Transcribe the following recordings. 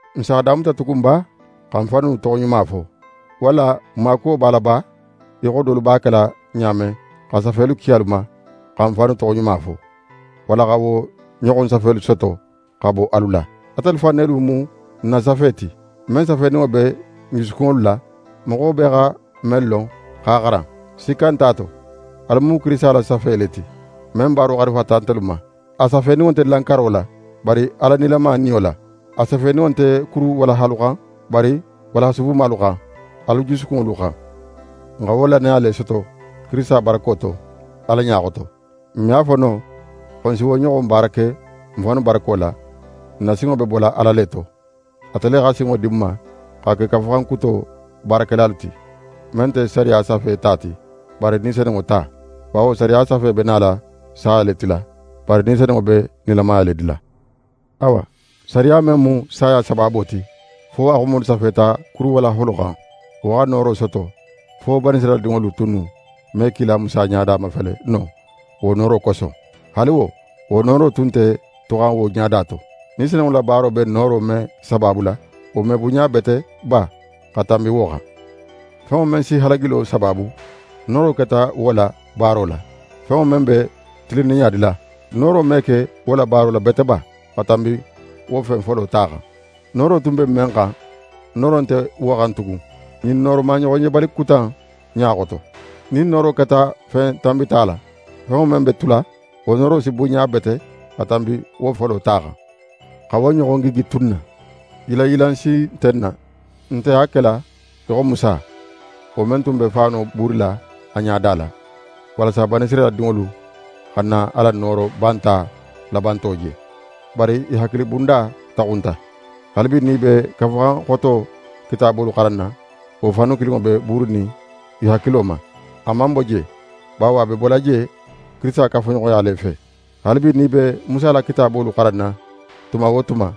N s'a damuta tugun ba xa n fannu toxoɲuma fo? Walla n maakuwo b'a la ba, í xo dolu b'a kela ɲa men xa safelu ki alu ma xa n fannu toxoɲuma fo, walla xa wo ɲoxon safelu soto xa bo alu la? Atelu fan nelu mu n na safe ti, men safeninŋo be n jusukunŋolu la, moxo bee xa men lon x'a xaran. Sikka nt'a to, alu mu Kirisita la safe le ti, men baaro xarifata ntelu ma. A safeninŋo nte lankaro la, bari Ala nilama Niyo la. A safeninŋo nte kuru walahalu xan, bari walaha subumalu xan, alu jusukunŋolu xan. N xa wo lannaya le soto Kirisita barako to, Ala ɲa xoto. N me a fo no xo n si wo ɲoxon baara ke n fannu barako la, n na sinŋo be bola Ala le to. Ate le xa sinŋo di n ma xa ke Kafuxan Kuto baarakelalu ti, men nte sariya safe ta ti, bari Ni Senunŋo ta. Bawo sariya safe be nala saya le tila, bari Ni Senunŋo be nilamaya le dila. Awa, sariya men mu saya sabaabo ti, fo a xumolu safeta kuru walaholu xan, wo xa nooro soto fo Banisirayila dinŋolu tunnu me kila Musa ɲada mafele no wo nooro koso. Haali wo, wo nooro tun nte tuxan wo ɲada to. Ni Senunŋo la baaro be nooro men sabaabula, wo me bunɲabete ba xa tanbi wo xan? Fenŋo men si halagilo sabaabu, nooro keta wo la baaro la; fenŋo men be tilinninɲa dila, nooro me ke wo la baaro la bete ba xa tanbi wo fen folo ta xan? Nooro tun be men xan, nooro nte wo xan tugun, ɲin nooro maɲoxonjebali kuta in ɲa xoto. Nin nooro keta fen tanbita la, fenŋo men be tula, wo nooro si bunɲa bete xa tanbi wo folo ta xan. Xa wo ɲoxon gigi tu n na, yilanyilan si nte n na. N nte a kela í xo Musa, wo men tun be faano buurila a ɲada la, walasa Banisirayila dinŋolu xana a la nooro banta labanto je. Bari i hakilibunda taxunta. Haalibi, nin i be Kafuxan Xoto kitaabolu xaranna, wo faanu kilinŋo be buurinin i hakilo ma. A man bo je bawo a be bola je Kirisita kafuɲoxoya le fe. Haalibi, nin i be Musa la kitaabolu xaranna tuma wo tuma,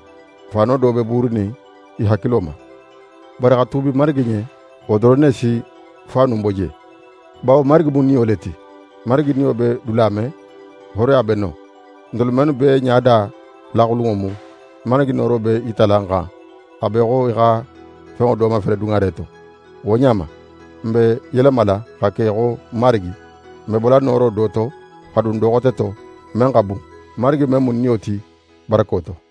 faano do be buurinin i hakilo ma. Bari xa tuubi Marigi ɲen, wo doron ne si faanu in bo je. Bawo Marigi mu Niyo le ti. Marigi Niyo be dula men, hooroya be non. Ntelu mennu bee ɲada laxulunŋo mu, Marigi nooro be í yitala n xan, a b'é xo í xa fenŋo do mafele duŋare to. Wo ɲa ma, n be yelemala xa ke í xo Marigi. N be bola nooro do to, xa dun do xote to, men xa bun, Marigi men mu Niyo ti barako to.